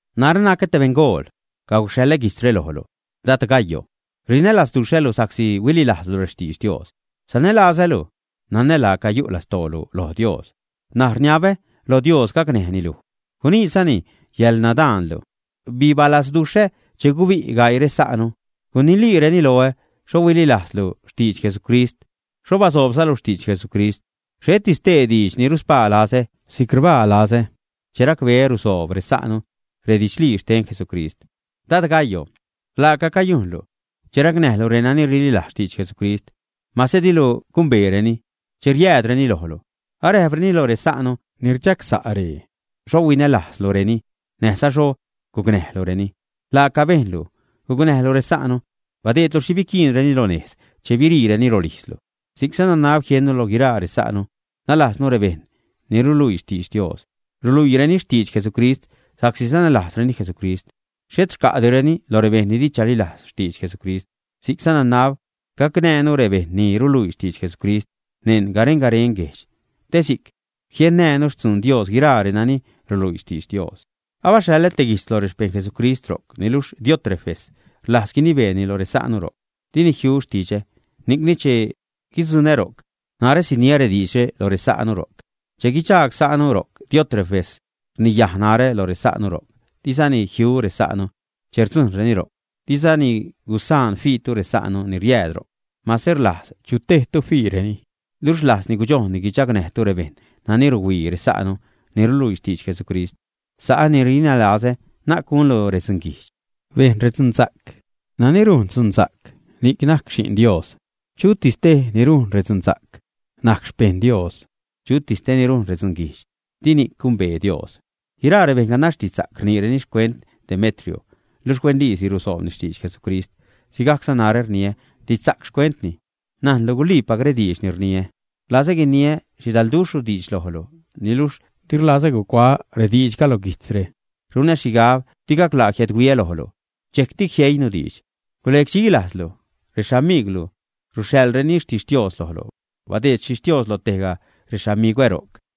Narä nacä te beṉgool. Caguxhaḻä guijtzre lojlu, dad Gayo. Rinälazduxhälu sa'csi huililajzlu rextidx Dios. Sanälazälu, nanä laaca yu' lastoolu loj Dios. N̲aj rniabä lo Dios gacnäjni luj, guniidxzani yäḻnadaanlu. Bibalazduxhä che gubi' gaii resa'nu, guniliireni loä xho huililajzlu xtidx Jesucrist, xho basoobzalu xtidx Jesucrist. Xheti stee diidx ni ruspaa lazä si'c rbaa lazä che racbeä rusoob resa'nu redidxlii xten Jesucrist. Dad Gayo, laaca cayujnlu che racnäjlu renani rililajz xtidx Jesucrist, mase dilu gumbeereni che riäädreni lojlu. Aräjpreni lo resa'nu ni rdxagsa' ree xho huinälajzlureni näjza xho gucnäjlureni. Laaca bejnlu gucnäjlu resa'nu, badeedlu xhi biquiinreni lo nejz che biriireni rolijzlu. Si'cza nanab jiennu lo guiraa resa'nu, nalajznu rebejṉ ni ruluii xtidx Dios. Ruluiireni xtidx Jesucrist sa'csi sanälajzreni Jesucrist. Xhet rca'direni lo rebejṉ ni di chalilajz xtidx Jesucrist. Si'cza nanab gacnäjnu rebejṉ ni riluii xtidx Jesucrist neṉ garen-garen guejdx, te si'c jiennänu xtzuun Dios guiraa renani ruluii xtidx Dios. Abaxhaḻä te guijtz lo rexpejṉ Jesucrist ro'c. Niluxh Diótrefes rlajz guinibeeni lo resa'nu ro'c. Dini jiu xtidxä. Ni'cni che guidzuṉä ro'c, narä siniä rediidxre lo resa'nu ro'c, che guidxaag sa'nu ro'c. Diótrefes rniyaj narä lo resa'nu ro'c. Dizani jiu resa'nu che rdzujṉreni ro'c. Dizani gusaan fiitu resa'nu ni riääd ro'c, mase rlajz chu tejtu fiireni. Luxh rlajzni gudxojnni guidxagnäjtu rebejṉ nani ruhuii resa'nu ni ruluii xtidx Jesucrist. Sa'ä ni rinälazä, na'c gunlu redzunguijdx, bejn redzunsa'c. Nani rujn dzunsa'c ni'c najc Xi'n Dios. Chutis tej ni rujn redzunsa'c najc xpejṉ Dios. Chutis tej ni rujn redzunguijdx, di ni'c gumbee Dios. Guiraa rebejṉ ganax didxsa'c rniireni xcuent Demetrio, luxh huenliisi rusoobni xtidx Jesucrist. Sigajcza narä rniä didxsa'c xcuentni. Najnlu guliipac rediidx ni rniä. Rlazä guiniä xhidalduxhru diidx lojlu, niluxh di rlazä gucuaä rediidxga lo guijtzre. Runä xhigab di gaclaa jiädhuiä lojlu, dxejcti jieinu diidx. Gulecdxi lajzlu. Rexamigwlu ruxhaḻreni xtixtios lojlu. Badeed xtixtios lo tejga rexamigwä ro'c.